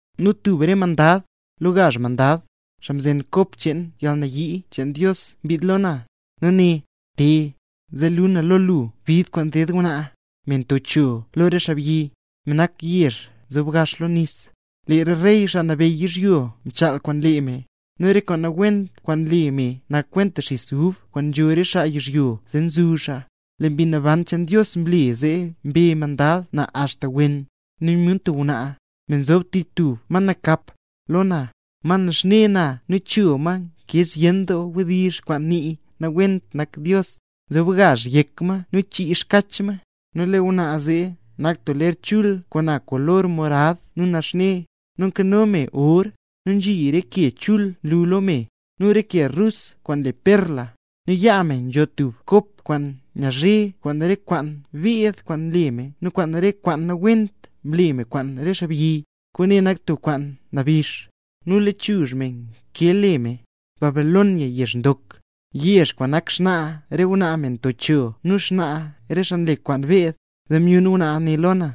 Nu tub re mandad, lo gazh mandad, xaa mzen kop cheen yalnayii cheen Dios mbid lo na, nu né: —Te, zee luu na lo lu bid kwaan ded ngwnaa, me nto cho lo re xaabyi, me nak tub yezh nzob gax lo nis. Lee re rey, xaa nabeyy yizhyo mchaal kwaan lee me, nu re kwaan nawent kwaan nle me nak kwenta xis ub kwaan nzho re xaa yizhyo zee nzuzh xaa. Nu Mbi Naban cheen Dios mle zee mbe mandad na axta wen; nu myun tub ngwnaa, me nzob tich tub ma nakap, lo na, ma naxne na nu cho ma nkee zyen wdizh kwaan nii nawent nak Dios, nu nzob gazh yek ma nu chii xkach ma. Nu lee ngwnaa zee nak tub ler chul, kwaan na kolor morad nu naxne, nu nkano me or, nu nzhi re ke chul nlu lo me, nu re ke rus kwaan le perla. Nu yaa me nzho tub kop kwaan nyazhe kwaan re kwaan mbeed kwaan mle me nu kwaan re kwaan nawent mle me kwaan re xaabyi. Kwaane nak tub kwaan nabix. Nu lechuzh me nkee le me: “Babilonia yezh ndok, yezh kwaan nak xnaa re ngwnaa me nto cho nu xnaa re xaa nle kwaan beed”. Zee myun ngwnaa ne lo na,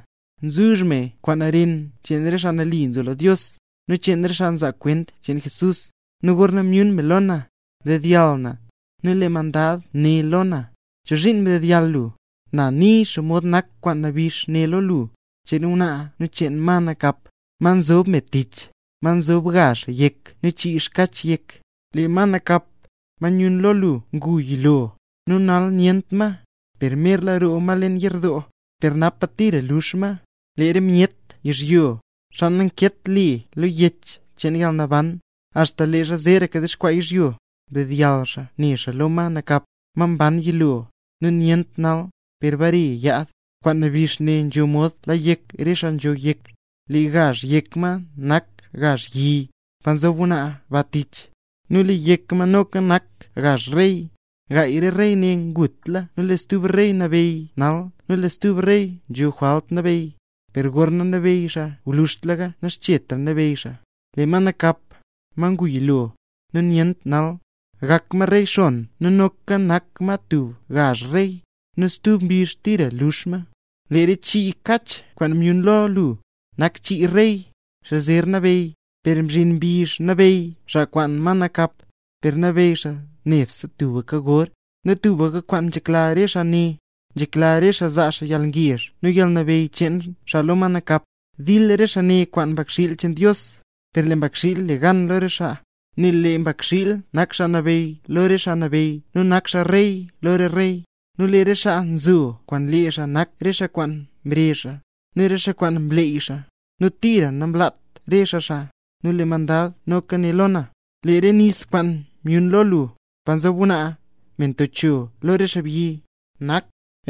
nzuzh me kwaan ren cheen re xaa mle nambey Jesús, nu cheen re xaa nzaa kwent cheen Jesús. Nu gorna myun me lo na, mdedyall na. Nu lee mandad né lo na: —¿Chozhiin ndedyall lu? Na nii xomod nak kwaan nabix ne lo lu, cheen ngwnaa nu cheen ma nakap, ma nzob me tich, ma nzob gazh yek nu chii kach yek. Lee ma nakap, ma myun lo lu ngu yilo, nu nal nyent ma, per merla roo ma leen yerdoo, per napa tira lux ma. Lee re myet yizhyo, xaa nankeet le lo Yech cheen Yalnaban, axta leezha zeeraka dexkwaa yizhyo, dedyall xaa ne xaa lo ma nakap, ma mban yilo, nu nyent nal, per bare yaad. ’Kwaan nabix ne nzho mod la yek re xaa nzho yek, lee gazh yek ma nak gazh yi, pa nzob ngwnaa ba tich, nu lee yek ma noka nak gazh rey. Gaay re rey ne ngutla nu lee stub rey nabeyy nal nu lee stub rey nzho jwalt nabeyy. Per gorna nabeyy xaa gwluzhtlaka naxchet nabeyy xaa. Lee ma nakap, ma ngu yilo, nu nyent nal, gak ma rey xon nu noka nak ma tub gazh rey, nu stub mbizh tira lux ma. ’Lee re chii kach kwaan myun lo lu, nak chii rey, xaa zer nabeyy; per zhin mbizh nabeyy xaa kwaan ma nakap, per nabeyy xaa nebse tubka gor. Nu tubka kwaan nzhekla re xaa ne, nzhekla re xaa zaa xaa yalngezh nu yalnabeyy cheen xaa lo ma nakap. Dil re xaa ne kwaan Mbakxiil cheen Dios, per lee Mbakxiil le gan lo re xaa, nel lee Mbakxiil nak Xaa Nabeyy lo re xaa nabeyy nu nak xaa Rey lo re rey. Nu lee re xaa nzo kwaan lee xaa nak re xaa kwaan mrezh xaa, nu re xaa kwaan mleey xaa, nu tira namlaat re xaa xaa. Nu lee mandad noka né lo na: —Lee re nis kwaan myun lo lu, pa nzob ngwnaa, me nto cho lo re xaabyi, nak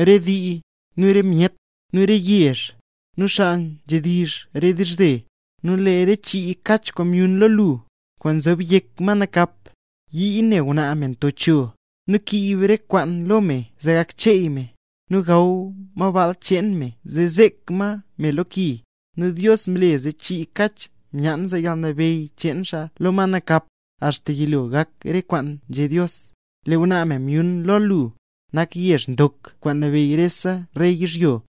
re dii, nu re myet, nu re yezh, nu xaa nzhedizh re dizhze. Nu lee re chii kach kwaan myun lo lu, kwaan nzob yek ma nakap, yii ne ngwnaa me nto cho, nu kiib re kwaan lo me zee gak cheey me, nu gaw ma baal cheen me nu zek ma me lo ki. Nu Dios mle zee lee chii kach myaan zaa yalnabeyy cheen xaa lo ma nakap, axta yilo gak re kwaan nzhé Dios. Lee ngwnaa me myun lo lu, nak yezh ndok kwaan nabeyy lo rese rey yizhyo.